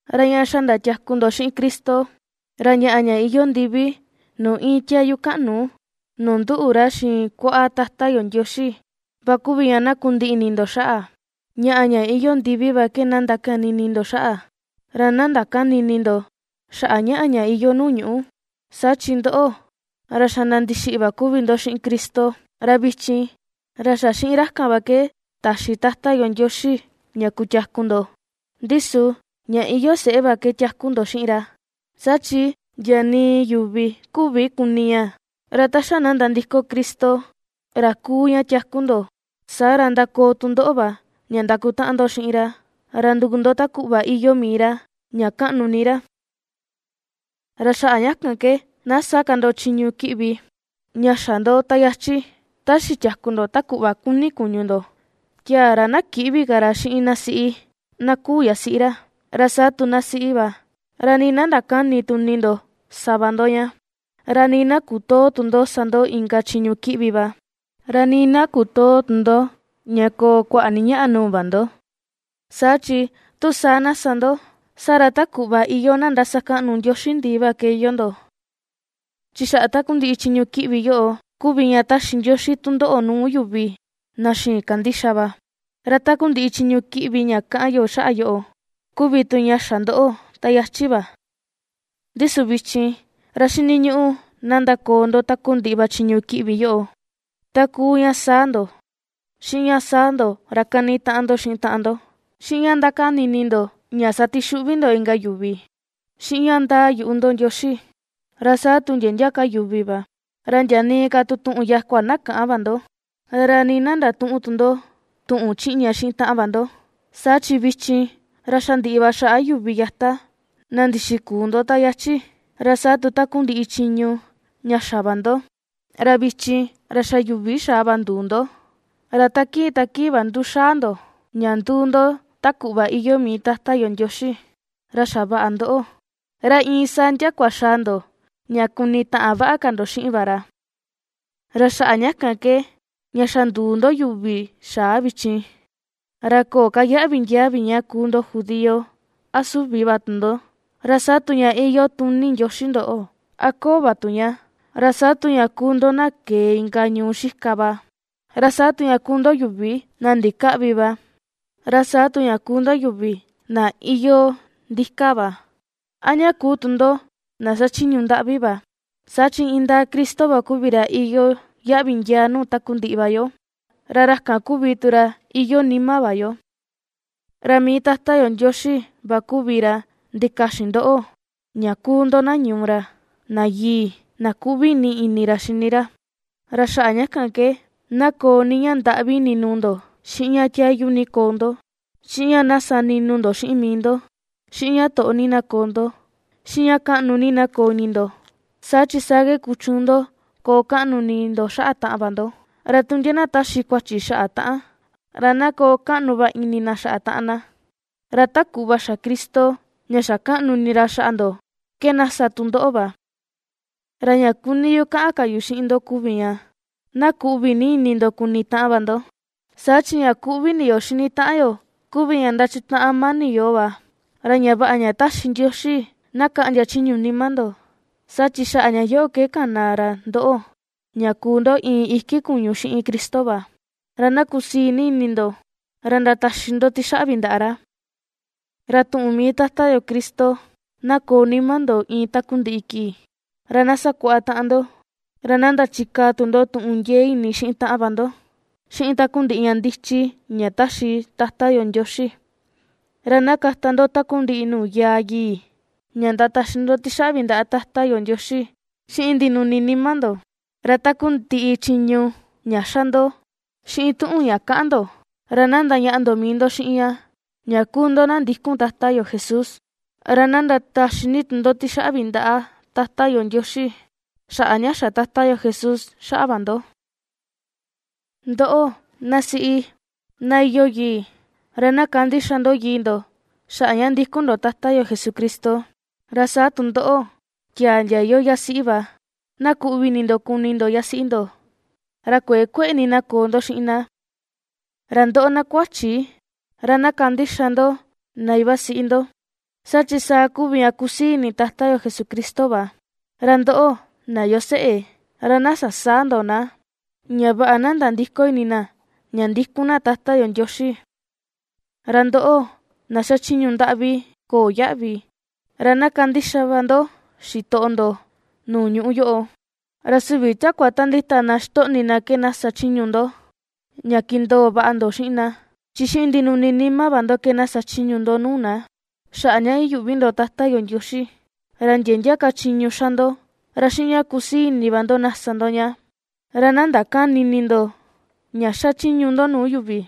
Ra ña xa ndatiaku ndo xiꞌin Cristo, ra ñaꞌa ña iyoo ndivi nuu iin tiayu kaꞌnu nuu nduꞌu ra xiin kuaꞌa Tata yo Ndioxi va kuvi ña na kundiꞌi ini ndo xaꞌa. Ñaꞌa ña iyoo ndivi va ke na ndakani ini ndo xaꞌa, ra na ndakäni ini ndo xaꞌa ñaꞌa ña iyoo nuu ñuꞌú. Saa chi ndoꞌo, ra xa na ndixiꞌi va kuvi ndo xiꞌin Cristo, ra vichin, ra xa xiꞌin ra kan va ke taxi Tata yo Ndioxi ña kutiaku ndo, ndi su, ña iyoo seꞌe va ke tiaku ndo xiꞌin ra, saa chi ndia nii yuvi küvi kuni ña. Ra ta xa na nandiko Cristo, ra kuu ña tiaku ndo, saa ra ^ndakoo tu ndoꞌo va ña ndakutaꞌan ndo xiꞌin ra, ra nduu ndo ta kuꞌva iyoo mii ra ña kaꞌnu ni ra. Ra xaꞌa ña kan ke na sä ka ndo chiñu kiꞌvi ña xa ndo ta yachi, ta xitiaku ndo ta kuꞌva kuni kuñu ndo: tiaa ra na kïꞌvi ka ra xiꞌin na siꞌi, na küu yasiꞌi ra, ra sa tu na siꞌi va, ra nii na ndakäni tu ini ndo sa va ndo ña, ra nii na kutöo tu ndo sa ndo inka nuu chiñu kiꞌvi va, ra nii na kutöo ni tu ndo ña koo kuaꞌa ni ñaꞌa nuu va ndo, saa chi tu saa na sa ndo, saa ra ta kuꞌva iyoo na ndasakaꞌnu ndioxi ndii va ke iyoo ndo. Chi xaꞌa takundiꞌi chiñu kiꞌvi yoꞌo kuvi ña ^taxi Ndioxi tundoꞌo nuu yuvi na xïin kandixa va. Ra takundiꞌi chiñu kiꞌvi ña kaꞌan yo xaꞌa yoꞌo, kuvi tu ña xa ndoꞌo, ta yachi va. Ndi su vichin, ra xiniñuꞌu na ndakoo ndo takundiꞌi va chiñu kiꞌvi yoꞌo: ta kuu ña saa ndo, xiꞌin ña saa ndo ra kani taꞌan ndo xiꞌin taꞌan ndo, xiꞌin ña ndakani ini ndo ña satixuꞌvi ndo inka yuvi, xiꞌin ña ndaa yuꞌu ndo Ndioxi, ra saa tu ndia ndia yuvi va, ra ndia nii ka tu tuꞌun yakua na käꞌan va ndo. Ra nii na ndatüꞌun tu ndo tuꞌun chiꞌña xiꞌin taꞌan va ndo, saa chi vichin, ra xa ndiꞌi va xaꞌa yuvi yata na ndixikuu ndo ta yachi, ra saa tu takundiꞌi chiñu ña xa va ndo, ra vichin, ra xa yuvi xaa va nduu ndo, ra ta kii ta kii va nduxaa ndo, ña nduu ndo ta kuꞌva iyoo mii Tata yo Ndioxi, ra xavaꞌa ndoꞌo, ra iin saa ndiakua xaa ndo ña kunitaꞌan vaꞌa ka ndo xiꞌin va ra. Ra xaꞌa ña kan ke ña xa nduu ndo yuvi xaa vichin, ra köo ka yaꞌvi ndiaa vi ña kuu ndo judío a süvi va tu ndo, ra saa tu ña iyoo tuni Ndioxi ndoꞌo, a köo va tu ña, ra saa tu ña kuu ndo na kee inka ñuu xika va, ra saa tu ña kuu ndo yuvi na ndikäꞌvi va, ra saa tu ña kuu ndo yuvi na iyoo ndika va, a ña kuu tu ndo na xachiñu ndaꞌvi va, saa chi indaa Cristo va kuvi ra iyoo yaꞌvi ndiaa nuu takundiꞌi va yo, ra ra kan kuvi tu ra iyoo nima va yo. Ra mii Tata yo Ndioxi va kuvi ra ndikaxin ndoꞌo, ña kuu ndo na ñuu ra, na yii, na kuꞌvi ni ini ra xini ra, ra xaꞌa ña kan ke na koo ni ña ndaꞌvi ini nuu ndo, xiꞌin ña tiayu ni koo ndo, xiꞌin ña sa ninu ndo xiꞌin mii ndo, xiꞌin ña toꞌo ni na koo ndo, xiꞌin ña kaꞌnu ni na koo ini ndo, saa chi saa ke kuchuun ndo koo kaꞌnu ini ndo xaꞌa taꞌan va ndo, ra tu ndia na taxi kuachi xaꞌa taꞌan, ra na koo kaꞌnu va ini na xaꞌa taꞌan na. Ra ta kuꞌva xa Cristo ña xa kaꞌnu ini ra xaꞌa ndo ke na sa tu ndoꞌo va. Ra ña kuni yu kaꞌan ka yu xiꞌin ndo kuvi ña, na kuꞌvi ni ini ndo kuni taꞌan va ndo, saa chi ña kuꞌvi ini yo xini taꞌan yo kuvi ña ndachutaꞌan mani yoo va. Ra ña vaꞌa ña taxi Ndioxi na kaꞌndia chiñu nima ndo, saa chi xaꞌa ña yoꞌo ke kana ra ndoꞌo ña kuu ndo iin iki kuñu xiꞌin Cristo va, ra na kusii ni ini ndo, ra ndataxi ndo tixaꞌvi ndaꞌa ra. Ra tuꞌun mii Tata yo Cristo, na koo nima ndo iin takundiꞌi kii. Ra na sakuaꞌa taꞌan ndo, ra na ndachikaa tu ndo tuꞌun ndiee ini xiꞌin taꞌan va ndo, xiꞌin takundiꞌi ña ndichi ña taxi Tata yo Ndioxi. Ra na kata ndo takundiꞌi nuu yaa yii, ña ndataxi ndo tixaꞌvi ndaꞌa Tata yo Ndioxi xiꞌin ndinuni nima ndo. Ra takundiꞌi chiñu ña xa ndo, xiꞌin tuꞌun ña kaꞌan ndo, ra na ndañaꞌa ndo mii ndo xiꞌin ña, ña kuu ndo na ndikun Tata yo Jesús, ra na ndataxi ni tu ndo tixaꞌvi ndaꞌa Tata yo Ndioxi, xaꞌa ña xa Tata Jesús xaꞌa va ndo. Ndoꞌo, na siꞌí, na iyoo yii, ra na kandixa ndo yii ndo, xaꞌa ña ndikun ndo Tata yo Jesucristo. Ra saa tu ndoꞌo, tiaa ndia iyoo yasiꞌi va, na kuꞌvi ni ini ndo kuni ndo yasiꞌi ndo, ra kuëe kueꞌe ni na koo ndo xiꞌin na. Ra ndoꞌo, na kua̱chí, ra na kandixa ndo na iva siꞌi ndo, saa chi saa kuvi ña kusii ini Tata yo Jesucristo va. Ra ndoꞌo, na iyoo seꞌe, ra na sasäa ndo na, ña vaꞌa na nandïko ini na ña ndikun na Tata yo Ndioxi. Ra ndoꞌo, na xachiñu ndaꞌvi köo yaꞌvi, ra na kandixa va ndo xitoꞌo ndo nuu ñuꞌu yoꞌo, ra süvi takua ta ndita na xitoꞌni na ke na sa chiñu ndo, ña kindoo vaꞌa ndo xiꞌin na, chi xiꞌin ndinuni nima va ndo ke na sachiñu ndo nuu na, xaꞌa ña iyuꞌvi ndo Tata yo Ndioxi. Ra ndia ndia ka chiñu xa ndo, ra xiꞌin ña kusii ini va ndo na sa ndo ña, ra na ndakäni ini ndo, ña xachiñu ndo nuu yuvi,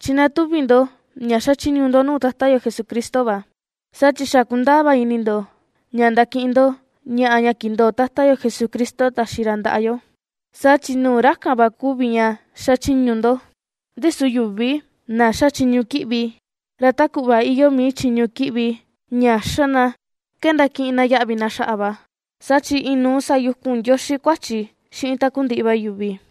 chi na tuvi ndo ña xachiñu ndo nuu Tata yo Jesucristo va. Saa chi xa kundaa va ini ndo, ña ndakiꞌin ndo ñaꞌa ña kindoo Tata yo Jesucristo taxi ra ndaꞌa yo. Saa chi nuu ra kan va kuvi ña xachiñu ndo. Ndi su yuvi na ^xa chiñu kiꞌvi, ra ta kuꞌva iyoo mii chiñu kiꞌvi ña xa na ke ndakiꞌin na yaꞌvi na xaꞌa va, saa chi inuu sayukun Ndioxi kuachi xiꞌin takundiꞌi va yuvi.